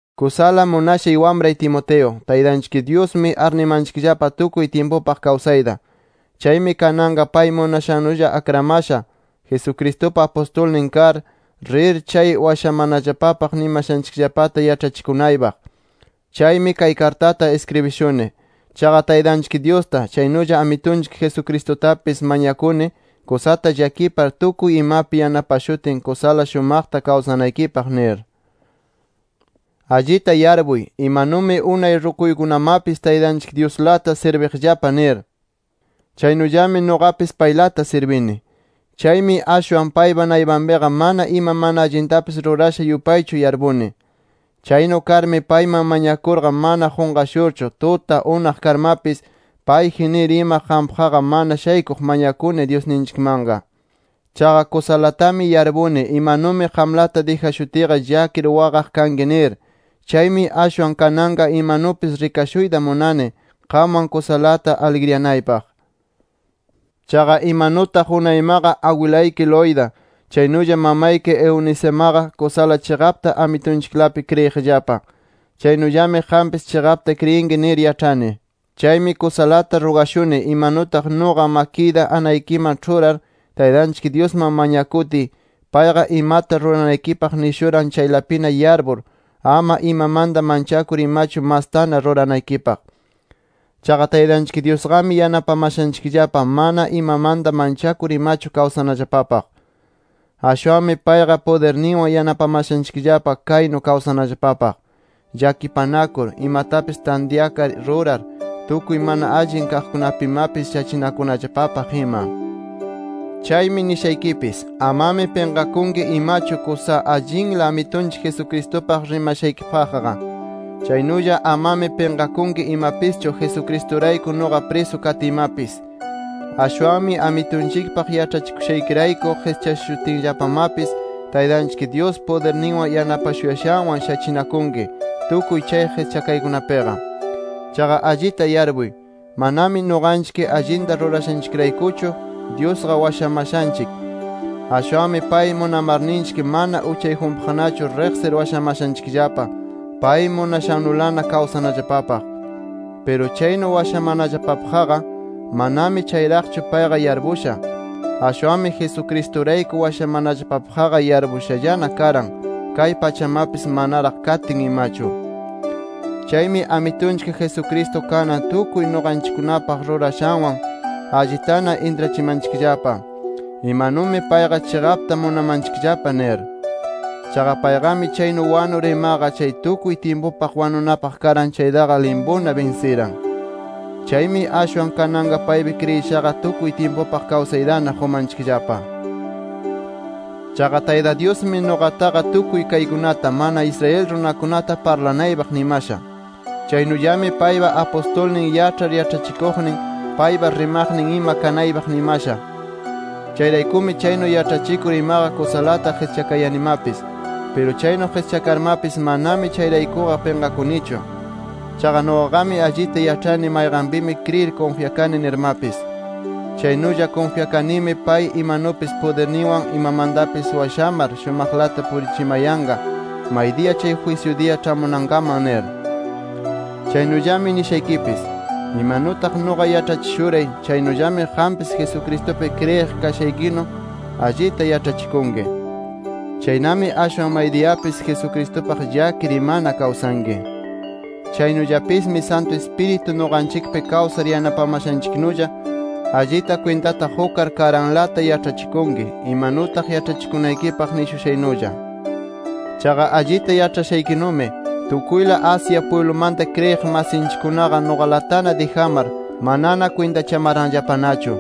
Kusala munashay wamray Timoteo, Taytanchik Dyusmi arnimanchikllapa tukuy tyimpupaq kawsayta. Chaymi kananqa pay munashannulla akramasha Jesucristupa apustulnin kar, rir chay washamanallapapaq nimashanchikllapata yaĉhachikunaypaq. Chaymi kay kartata iskribishuni. Chaqa Taytanchik Dyusta, chaynulla Amitunchik Jesucristutapis, mañakuni kusata llakipar tukuy imapi yanapashutin kusala shumaqta kawsanaykipaq nir. Allita yarpuy, imanumi unay rukuykunamapis Taytanchik Dyuslata sirbiqllapa nir. Chaynullami nuqapis paylata sirbini. Chaymi ashwan paypa naypanpiqa mana ima mana allintapis rurasha yupaychu yarpuni. Chaynu karmi payman mañakurqa mana qunqashurchu tuta, unaq karmapis payji nir ima qampaqqa mana shaykuq mañakuni Dyusninchikmanqa. Chaqa kusalatami yarpuni imanumi qamlata dijashutiyqa llakir waqaq kanki nir. Chaymi ashwan kananqa imanupis rikashuyta munani, qamwan kusalata aligriyanaypaq. Chaqa imanutaq unaymaqa agwilayki Loida, chaynulla mamayki Eunicemaqa kusala chiqapta Amitunchiklapi kriyiqllapa, chaynullami qampis chiqapta kriyinki nir yaĉhani. Chaymi kusalata rugashuni imanutaq nuqa makiyta anaykiman ĉhurar, Taytanchik Dyusman mañakutiy, payqa imata ruranaykipaq nishuran chaylapina yarpur, ama imamanta manchakur imachu mastana ruranaykipaq. Chaqa Taytanchik Dyusqami yanapamashanchikllapa mana imamanta manchakur imachu kawsanallapapaq. Ashwanmi payqa pudirninwan yanapamashanchikllapa kaynu kawsanallapapaq: Llakipanakur, imatapis tantyakar rurar, tukuy mana allin kaqkunapimapis shachinakunallapapaq ima. Chaymi nishaykipis: Amami pinqakunki imachu kusa allinla Amitunchik Jesucristupaq rimanaykipaqqa. Chaynulla amami pinqakunki imapischu Jesucristurayku nuqa prisu katiymapis. Ashwanmi Amitunchikpaq yaĉhachikushaykirayku qischashutinllapamapis, Taytanchik Dyus pudirninwan yanapashuyashanwan shachinakunki, tukuy chay qischakaykunapiqa. Chaqa allita yarpuy, manami nuqanchik allinta rurashanchikraykuchu Dyusqa washamashanchik. Ashwanmi pay munamarninchik mana uchayjunpaqnachu riqsir washamashanchikllapa, pay munashannulana kawsanallapapaq. Piru chaynu washamanallapapaqqa manami chayraqchu payqa yarpusha. Ashwanmi Jesucristurayku washamanallapapaqqa yarpushallana karan, kay pachamapis manaraq kayatin imachu. Chaymi Amitunchik Jesucristo kanan tukuy nuqanchikkunapaq rurashanwan allitana intrachimanchikllapa imanumi payqa chiqapta munamanchikllapa nir. Chaqa payqami chaynu wanur imaqa chay tukuy tyimpupaq wanunapaq karan chaytaqa limpuna binsiran. Chaymi ashwan kananqa paypi kriyishaqa tukuy tyimpupaq kawsaytana qumanchikllapa. Chaqa Tayta Dyusmi nuqataqa tukuy kaykunata [mana Israel runakunata] parlanaypaq nimasha. Chaynullami paypa apustulnin, yaĉhar yaĉhachikuqnin, paypa rimaqnin ima kanaypaq nimasha. Chayraykumi chaynu yaĉhachikur imaqa kusalata qischakayanimapis. Piru chaynu qischakarmapis manami chayraykuqa pinqakunichu. Chaqa nuqaqami allita yaĉhani mayqanpimi kriyir kunfyakani nirmapis. Chaynulla kunfyakanimi pay imanupis pudirninwan imamantapis washamar shumaqlata purichimayanqa maydiya chay jwisyu diya ĉhamunankaman nir. Chaynullami nishaykipis: Imanutaq nuqa yaĉhachishuray, chaynullami qampis Jesucristupi kriyiq kashaykinu allita yaĉhachikunki. Chaynami ashwan maydiyapis Jesucristupaq llakir imana kawsanki. Chaynullapismi Santu Ispiritu nuqanchikpi kawsar yanapamashanchiknulla, allita kwintata qukar karanlata yaĉhachikunki, imanutaq yaĉhachikunaykipaq nishushaynulla. Chaqa allita yaĉhashaykinumi, tukuyla Asia pwiblumanta kriyiq masinchikkunaqa nuqalatana dijamar, manana kwintachamaranllapanachu.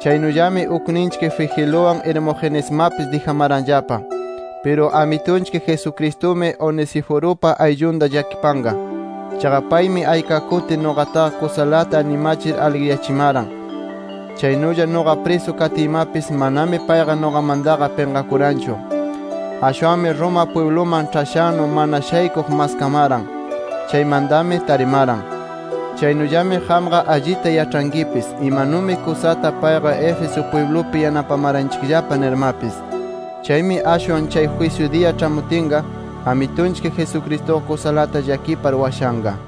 Chaynullami ukninchik Figeluwan, Hermogenesmapis dijamaranllapa. Piru Amitunchik Jesucristumi Onesiforupa ayllunta llakipanqa. Chaqa paymi ayka kuti nuqataqa kusalata animachir aligriyachimaran. Chaynulla nuqa prisu katiymapis, manami payqa nuqamantaqa pinqakuranchu. Ashwanmi Roma pwibluman ĉhashannu, mana shaykuq maskamaran. Chaymantami tarimaran. Chaynullami qamqa allita yaĉhankipis imanumi kusata payqa Éfeso pwiblupi yanapamaranchikllapa nirmapis. Chaymi ashwan chay jwisyu diya ĉhamutinqa Amitunchik Jesucristuqa kusalata llakipar washanqa.